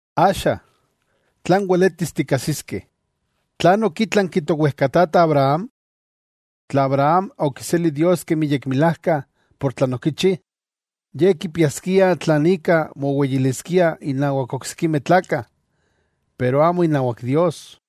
Axa, tlan weletis tikkajsiskeh, ¿tlan okitlanki towejkatata Abraham? Tla Abraham okiseli Dios kemi yekmilajka por tlan okichi, ye kipiaskia tlan ika moweyiliskia innawak oksikimeh tlakah, pero amo inawak Dios.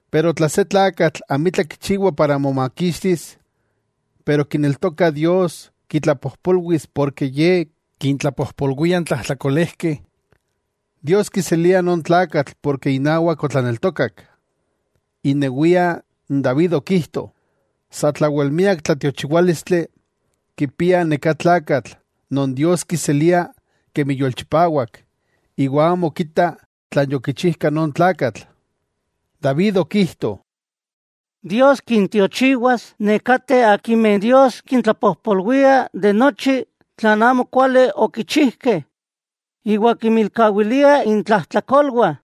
Pero tla se tlakatl amitla kichiwa para momakixtis, pero kineltoka Dios kitlapojpolwis porke ye kintlapojpolwia n tlajtlakolejkeh, Dios kiselia non tlakatl porke inawak otlaneltokak. Inewia n David okijto, satlawel miak tlatiochiwálistli kipia neká tlakatl non Dios kiselia kemi yolchipawak iwa amo kita tlan yokichijka non tlakatl. David okijto: ¡Dios kintiochiwas nekateh akimeh Dios kintlapojpolwia de nochi tlan amokuali okichijkeh iwa kinmilkawilia intlajtlakolwah!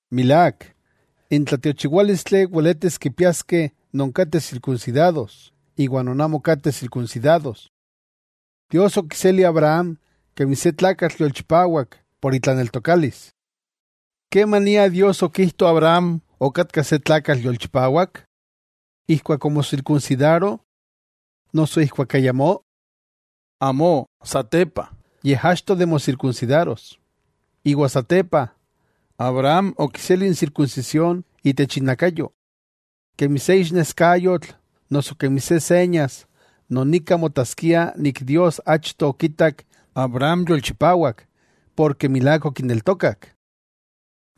Milák, n tlatiochiwálistli weletis kipiaskeh non kateh sirkunsidados, iwa non amo kateh sirkunsidados. Dios okiseli Abraham kemi se tlakatl yolchipawak por itlaneltokalis. ¿Kemania Dios okijto Abraham okatka se tlakatl yolchipawak? ¿Ijkuak omosirkunsidaro, noso ijkuak ayamó? Amo satepa, yej achto de mosirkunsidaros. Iwa satepa, Abraham okiseli n sirkunsisión itech inakayo, kemi se ixneskayotl noso kemi se señas non ika motaskia nik Dios achto okitak Abraham yolchipawak porke milák okineltokak.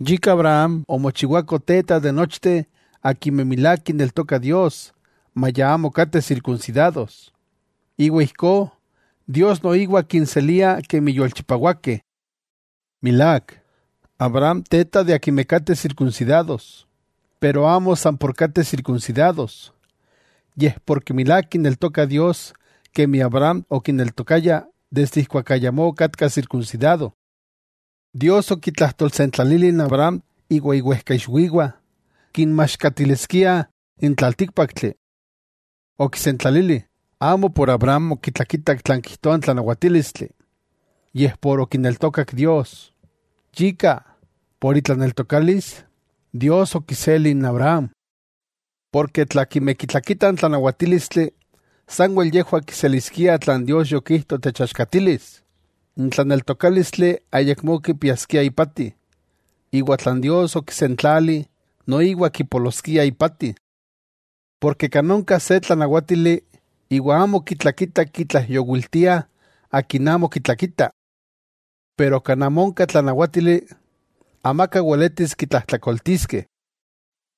Yika Abraham omochiwako teta de nochteh akimeh milák kineltokah Dios maya amo kateh sirkunsidados, iwa ijkó Dios noiwa kinselia kemi yolchipawakeh. Milák, Abraham teta de akimeh kateh sirkunsidados, pero amo san por kateh sirkunsidados, yej porke milák kineltokah Dios kemi Abraham okineltokaya desde ijkuak ayamó okatka sirkunsidado. Dios okitlajtolsentlalili n Abraham iwa iwejkaixwiwah kinmaxkatiliskia n tlaltíkpaktli. Okisentlalili, amo por Abraham okitlakitak tlan kijtoa n tlanawatílistli, yej por okineltokak Dios. Yika por itlaneltokalis, Dios okiseli n Abraham. Porke tla akimeh kitlakitah n tlanawatílistli sanwel yejwah kiseliskiah tlan Dios yokijto techaxkatilis, n tlaneltokálistli ayakmó kipiaskia ipati, iwa tlan Dios okisentlali noiwa kipoloskia ipati. Porke kan onka se tlanawátili iwa amo kitlakitah kitlaijyowiltiah akin amo kitlakita. Pero kan amo onka tlanawátili, amaka weletis kitlajtlakoltiskeh.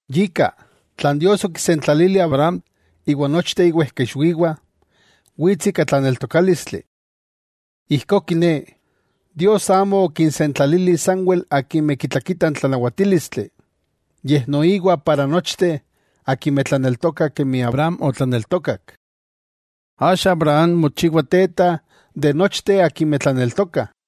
Yika, tlan Dios okisentlalili Abraham iwa nochteh iwejkaixwiwah, wits ika tlaneltokálistli. Ijkó kiné, Dios amo okinsentlalili sanwel akimeh kitlakitah n tlanawatílistli, yej noiwa para nochteh akimeh tlaneltokah kemi Abraham otlaneltokak. Axa Abraham mochiwa teta de nochteh akimeh tlaneltokah.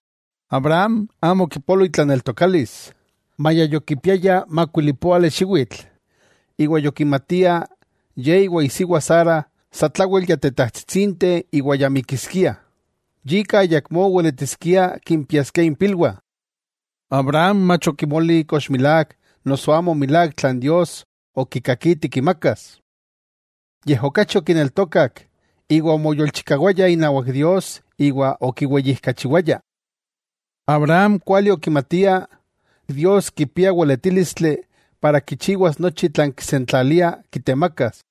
Abraham amo okipolo itlaneltokalis, maya yokipiaya makuilipóali xiwitl iwa yokimatia ye iwa isiwa Sara satlawel ya tetajtsitsinteh iwa ya mikiskiah, yika ayakmó weletiskiah kimpiaskiah impilwah. Abraham mach okimoli kox milák noso amo milák tlan Dios okikakiti kimakas. Yej okachi okineltokak iwa omoyolchikawaya inawak Dios iwa okiweyijkachiwaya. Abraham kuali okimatia Dios kipia weletílistli para kichiwas nochi tlan kisentlalia kitemakas: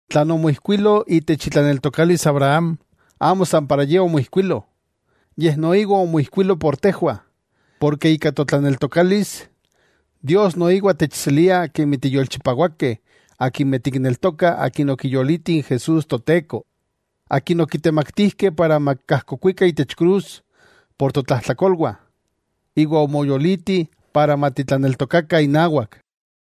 Tlan omoijkuilo itech itlaneltokalis Abraham, amo san para ye omoijkuilo, yej noiwa omoijkuilo por tejwah, porke ika totlaneltokalis, Dios noiwa techselia kemi tiyolchipawakeh akimeh tikneltokah akin okiyoliti n Jesús Toteko, akin okitemaktijkeh para makajkokuika itech krus por totlajtlakolwah, iwa omoyoliti para matitlaneltokakah inawak.